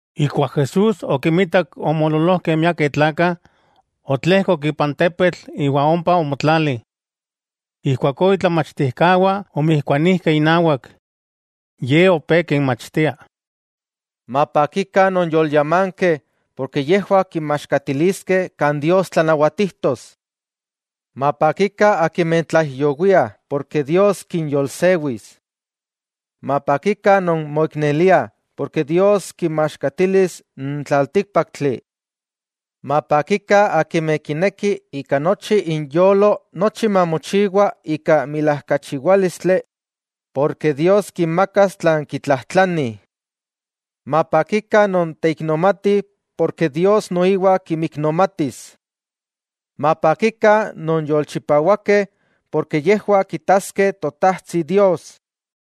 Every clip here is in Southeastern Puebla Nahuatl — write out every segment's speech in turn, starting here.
Ijkuak Jesús okinmitak omoololojkeh miakeh tlakah, otlejkok ipan tepetl iwa ompa omotlali. Ijkuakó itlamachtijkawah omijkuanijkeh inawak. Ye opé kinmachtia: —Mapakikah non yolyámankeh, porke yejwah kinmaxkatiliskeh kan Dios tlanawatijtos. 'Mapakikah akimeh tlaijyowiah, porke Dios kinyolsewis. 'Mapakikah non moikneliah, porke Dios kinmaxkatilis n tlaltíkpaktli. 'Mapakikah akimeh kinekih ika nochi inyolo nochi mamochiwa ika milajkachiwálistli, porke Dios kinmakas tlan kitlajtlanih. 'Mapakikah non teiknomatih, porke Dios noiwa kimiknomatis. 'Mapakikah non yolchipawakeh, porke yejwah kitaskeh Totajtsi Dios.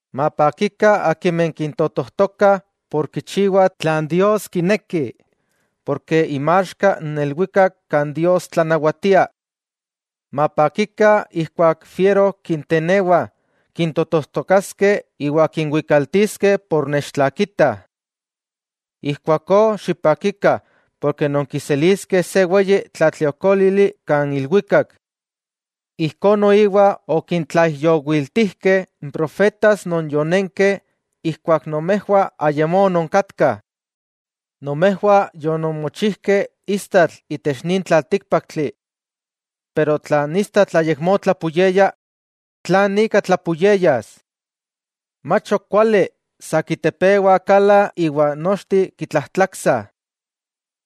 'Mapakikah akimeh kintotojtokah por kichiwah tlan Dios kineki, porke inmaxka n ilwikak kan Dios tlanawatia. 'Mapakikah ijkuak fiero kintenewah, kintotojtokaskeh iwa kinwikaltiskeh por nechtlakitah. Ijkuakó xipakikah porke nonkiseliskeh se weyi tlatliokólili kan ilwikak. Ijkó noiwa okintlaijyowiltijkeh n profetas non yonenkeh ijkuak nomejwah ayamó ononkatkah. 'Nomejwah yononmochijkeh istatl itech nin tlaltíkpaktli. Pero tla n istatl ayakmó tlapuyeya, ¿tlan ika tlapuyeyas? Mach ok kuali, sa kitepewah kala iwa nochteh kitlajtlaksah.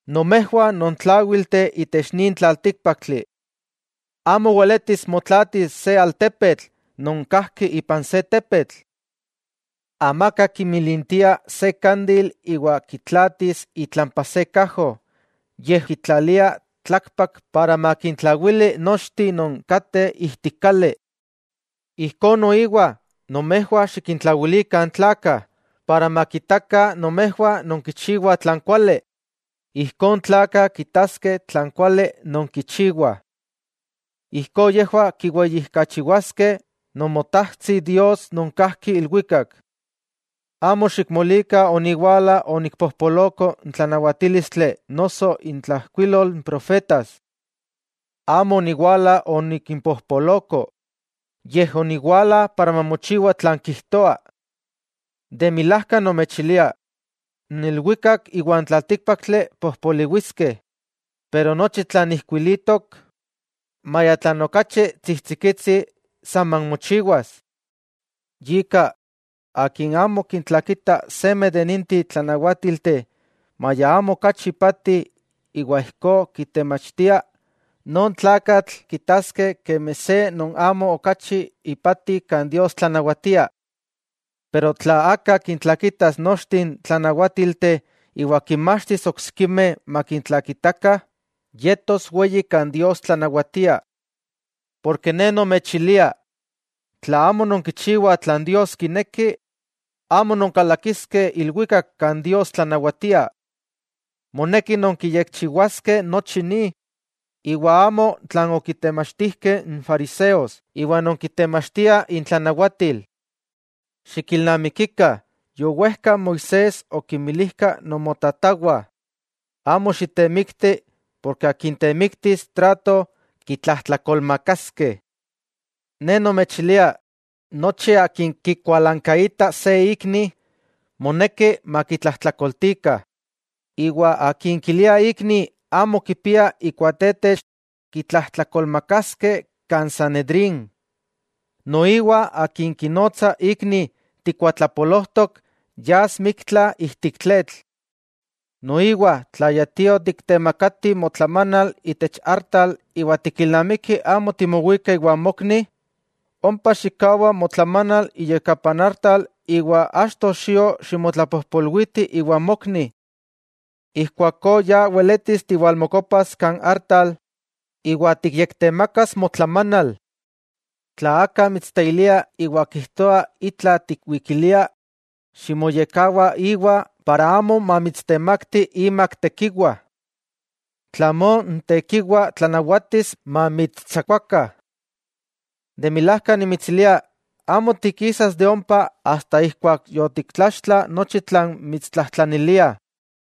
'Nomejwah non tláwilteh itech nin tlaltíkpaktli. Amo weletis motlaatis se altepetl non kajki ipan se tepetl. Amaka kimilintia se kandil iwa kitlaatis itlampa se kajo, yej kitlalia tlakpak para makintlawili nochteh non kateh ijtik kali. Ijkó noiwa, nomejwah xikintlawilikah n tlakah para makitakah nomejwah nonkichiwah tlan kuali, ijkó n tlakah kitaskeh tlan kuali nonkichiwah. Ijkó yejwah kiweyijkachiwaskeh Nomotajtsi Dios non kajki ilwikak. 'Amo xikmolikah oniwala onikpojpoloko n tlanawatílistli noso intlajkuilol n profetas. Amo oniwala onikimpojpoloko, yej oniwala para mamochiwa tlan kijtoa. De milajka nomechilia, n ilwikak iwan tlaltíkpaktli pojpoliwiskeh, pero nochi tlan ijkuilitok, maya tlan okachi tsijtsikitsi, saman mochiwas. Yika, akin amo kintlakita seme de ninteh tlanawátilteh, maya amo okachi ipati, iwa ijkó kitemachtia, non tlakatl kitaskeh kemi se non amo okachi ipati kan Dios tlanawatia. Pero tla aka kintlakitas nochteh n tlanawátilteh iwa kinmachtis oksikimeh makintlakitakah, yetos weyi kan Dios tlanawatia. Ne nomechilia, tla amo nonkichiwah tlan Dios kineki, amo nonkalakiskeh ilwikak kan Dios tlanawatia. Moneki nonkiyekchiwaskeh nochi ni, iwa amo tlan okitemachtijkeh n fariseos iwa non kitemachtiah intlanawatil. 'Xikilnamikikah yowejka Moisés okinmilijkah nomotatawah: “Amo xitemikti, porke akin temiktis trato kitlajtlakolmakaskeh.” Ne nomechilia: Nochi akin kikualankaita se ikni, moneki makitlajtlakoltikah. Iwa akin kilia ikni amo kipia ikuatetex, kitlajtlakolmakaskeh kan Sanedrín. Noiwa akin kinotsa ikni tikuatlapolojtok, yas miktla ijtik tletl. 'Noiwa, tla ya tio tiktemakati motlamanal itech artal iwa tikilnamiki amo timowika iwan mokni, ompa xikkawa motlamanal iyakapa n artal iwa achto xio ximotlapojpolwiti iwa mokni. Ijkuakó ya weletis tiwalmokopas kan artal iwa tikyektemakas motlamanal. 'Tla aka mitsteilia iwa kijtoa itla tikwikilia, ximoyekkawa íwa, para amo mamitstemakti imak tekiwa, tlamó n tekiwa tlanawatis mamitstsakuakah. De milajka nimitsilia, amo tikisas de ompa asta ijkuak yotiktlaxtla nochi tlan mitstlajtlanilia.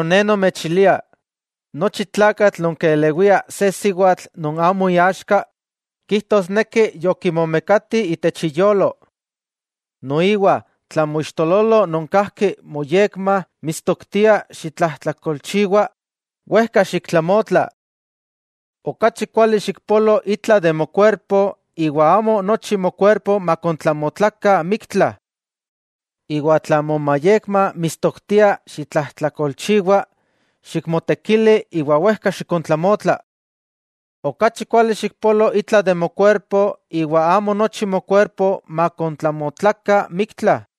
Ne nomechilia, nochi tlakatl non kelewia se siwatl non amo iaxka, kijtosneki yokimomekati itech iyolo. 'Noiwa, tla moixtololo non kajki moyekma mitstoktia xitlajtlakolchiwa, wejka xiktlamotla. Okachi kuali xikpolo itla de mokuerpo, iwa amo nochi mokuerpo makontlamotlakah miktla. Iwa tla momayekma mitstoktia xitlajtlakolchiwa, xikmotekili iwa wejka xikontlamotla. Okachi kuali xikpolo itla de mokuerpo, iwa amo nochi mokuerpo makontlamotlakah miktla.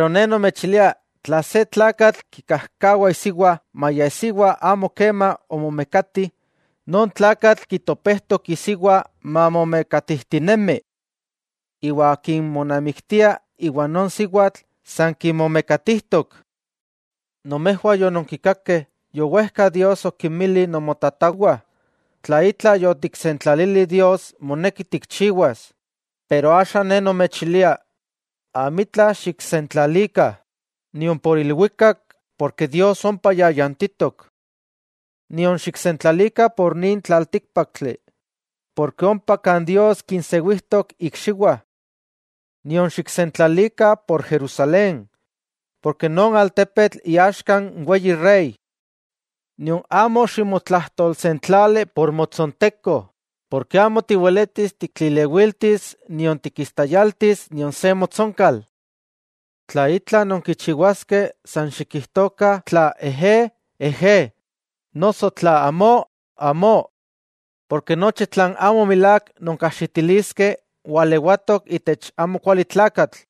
Ne nomechilia: tla se tlakatl kikajkawa isiwa, maya isiwa amo kema omomekati, non tlakatl kitopejtok isiwa mamomekatijtinemi. Iwa akin monamiktia iwa non siwatl, san kimomekatijtok. 'Nomejwah yononkikakeh yowejka Dios okinmili nomotatawah: “Tla itla yotiksentlalili Dios, moneki tikchiwas.” Axa Ne nomechilia, amitla xiksentlalikah: nion por ilwikak, porke Dios ompa yayantitok. Nion xiksentlalikah por nin tlaltíkpaktli, porke ompa kan Dios kinsewijtok ikxiwah. Nion xiksentlalikah por Jerusalén, porke non altepetl iaxka n Weyi Rey. Nion amo ximotlajtolsentlali por motsonteko, porke amo tiweletis tiktlilewiltis nion tikistayaltis nion se motsonkal. Tla itla nonkichiwaskeh san xikijtokah tla “ejé”, “ejé”, noso tla “amó”, “amó”, porke nochi tlan amo milák nonkajxitiliskeh, walewatok itech amokualitlakatl.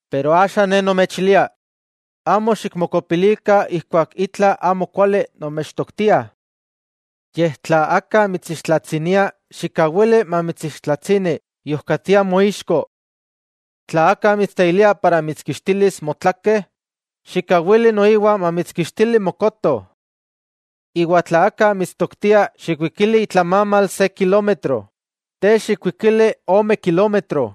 Pero axa Ne nomechilia: Amo xikmokopilikah ijkuak itla amo kuali nomechtoktiah. Yej, tla aka mitsixtlatsinia xikkawili mamitsixtlatsini iojkatia moixko. Tla aka mitsteilia para mitskixtilis motlake, xikkawili noiwa mamitskixtili mokoto. Iwa tla aka mitstoktia xikwikili itlamamal se kilómetro, te xikwikili ome kilómetro.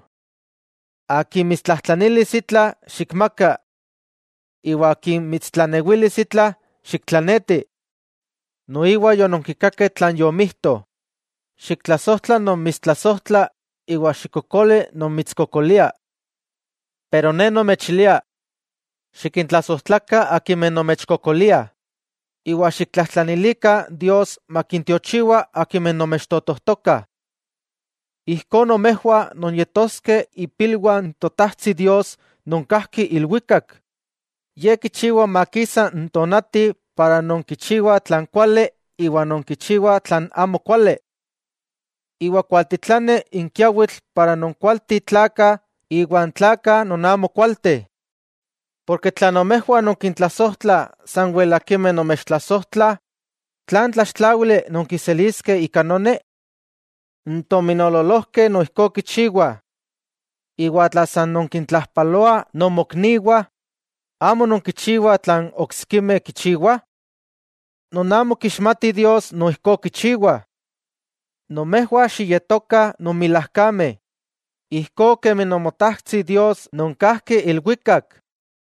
Akin mitstlajtlanilis itla, xikmaka. Iwa akin mitstlanewilis itla, xiktlaneti. 'Noiwa yononkikakeh tlan yomijto: “Xiktlasojtla non mitstlasojtla, iwa xikkokoli non mitskokolia.” Pero Ne nomechilia: Xikintlasojtlakah akimeh nomechkokoliah, iwa xiktlajtlanilikah Dios makintiochiwa akimeh nomechtotojtokah. Ijkó nomejwah nonyetoskeh ipilwah n Totajtsi Dios non kajki ilwikak. Ye kichiwa makisa n tonati impa non kichiwah tlan kuali iwa kichiwah tlan amo kuali. Iwa kualtitlani n kiawitl impa n kualteh tlakah iwa n tlakah non amo kualteh. Porke tla nomejwah nonkintlasojtlah sanwel akimeh nomechtlasojtlah, ¿tlan tlaxtláwili nonkiseliskeh ika noni? N tominoololojkeh noijkó kichiwah. Iwa tla san nonkintlajpaloah nomokniwah, ¿amo nonkichiwah tlan oksikimeh kichiwah? Non amo kixmatih Dios, noijkó kichiwah. Nomejwah xiyetokah non milajkameh, ijkó kemi Nomotajtsi Dios non kajki ilwikak.